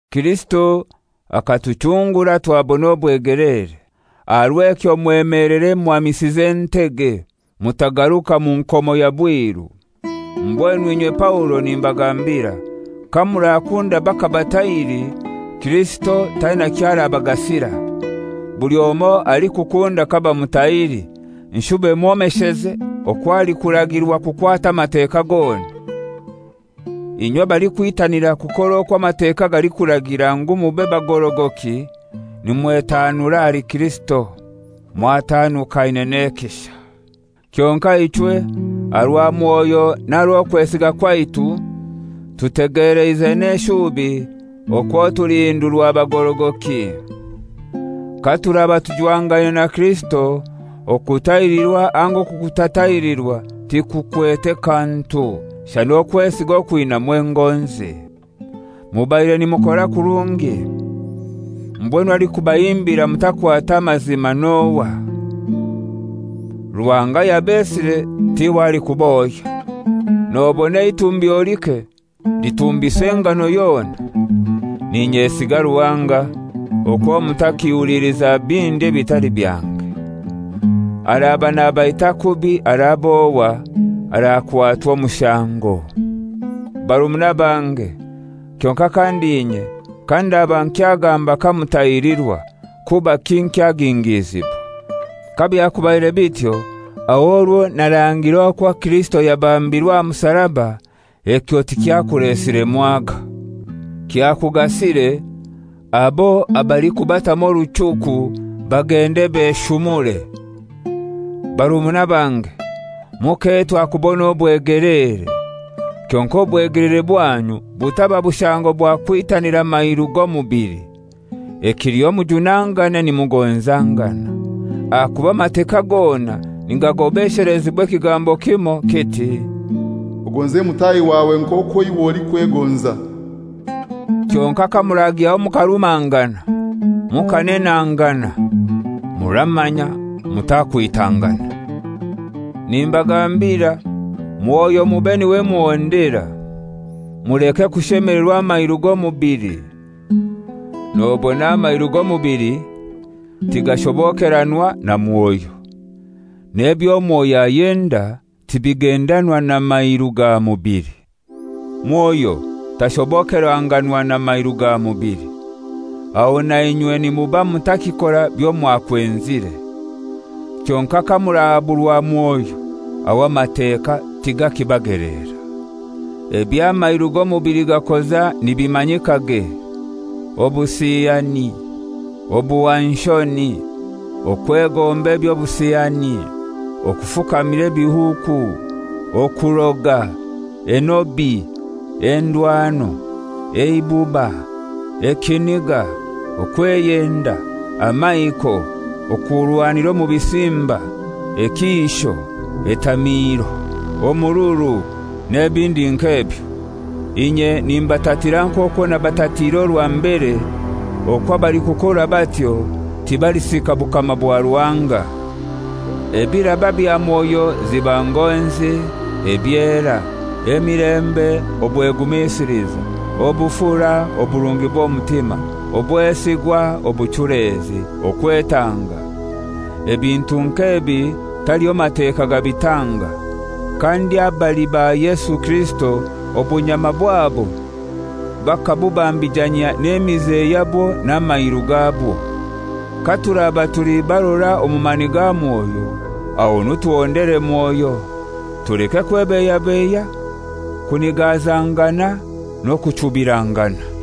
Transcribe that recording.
Kirisito akatuchungura twabona obwegeleere. Aha rw'ekyo mwemelere muhamisize entege, mutakugaruka mu nkomo ya bwiru. Mbwenu inye Paulo, nimbagambira: Kamurakunda bakabatahiri, Kirisito taina kyo arabagasira. Buli omoi alikukunda kabamutahiri nshube mwomesheze okwo alikuragirwa kukwata Amateka gona. Inywe abalikwitanira kukora okwo Amateeka galikuragira ngu mube bagorogoki nimwetaanura ahali Kirisito; mwataanukaine n'ekisha. Kyonkai ichwe, aha rwa Mwoyo n'aha rw'okwesiga kwaitu, tutegeleize n'eshubi okwo tulihindurwa bagorogoki. Katuraba tujwangaine na Kirisito, okutahirirwa anga okutatahirirwa tikukwete kantu, shana okwesiga okwinamu engonzi. Mubaire nimukora kurungi. Mbwenu alikubahimbira mutakwata amazima n'ohai? Ruhanga ayabesire tiwe alikubohya. Nobona eitumbyo like litumbisa engano yona. N'inyesiga Ruhanga okwo mutakiiliza bindi ebitali byange. Araba nabaita kubi, arab'ohai, arakwatwa omushango. Barumuna bange, kyonkai kandi inye, kandaba nkyagamba kamutahirirwa, kubaki nkyagingizibwa? Kabyakubaire bityo, aho orwo narangire okwo Kirisito yabambirwe aha musaraba ekyo tikyakulesire mwaga. Kyakugasire, abo abalikubatamu oruchuku bagende beshumure! Barumuna bange, muketwa kubona obwegeleere. Kyonkai obwegeleere bwanyu butaba bushango bwa kwitanira mairu g'omubili. Ekiliho mujunangane nimugonzangana. Ahakuba Amateka gona nigagobeshelezibwa ekigambo kimoi, kiti, «Ogonze mutahi wawe nk'okwo iwe olikwegonza.» Kyonkai kamuragyaho mukarumangana, mukanenangana, muramanya mutakwitangana. Nimbagambira, Mwoyo mube niwe muhondera. Muleke kushemelerwa amairu g'omubili. Nobona amairu g'omubili tigashobokeranwa na Mwoyo, n'ebyo Mwoyo ayenda tibigendanwa na mairu ga mubili. Mwoyo tashobokerwangana na mairu ga mubili. Aho nainywe nimuba mutakikora byomwakwenzire. Kyonkai kamurahaburwa Mwoyo, aho Amateka tigakibageleera. Eby'amairu g'omubili gakoza nibimanyikage: Obusiyani, obuhwanshoni, okwegomba eby'obusiyani, kufukamira ebihuuku, okuroga, enobi, endwano, eibuba, ekiniga, okweyenda, amaiko, okurwanira omu bisimba, ekiisho, etamiiro, omururu n'ebindi nk'ebyo. Inye nimbatatira nk'okwo nabatatiire orwa mbere, okwo abalikukora batyo tibalisika bukama bwa Ruhanga. Ebiraba bya Mwoyo ziba ngonzi, ebyera, emilembe, obwegumisiliza, obufura, oburungi bw'omutima, obwesigwa, obuchulezi, okwetanga; ebintu nk'ebi taliho Mateka gabitanga. Kandi abali ba Yesu Kirisito obunyama bwabo bakabubambijanyia n'emize yabwo n'amairu gabwo. Katuraba tuli barora omu mani ga Mwoyo, ahonu tuhondere Mwoyo. Tuleke kwebeiyabeiya, kunigazangana n'okuchubirangana.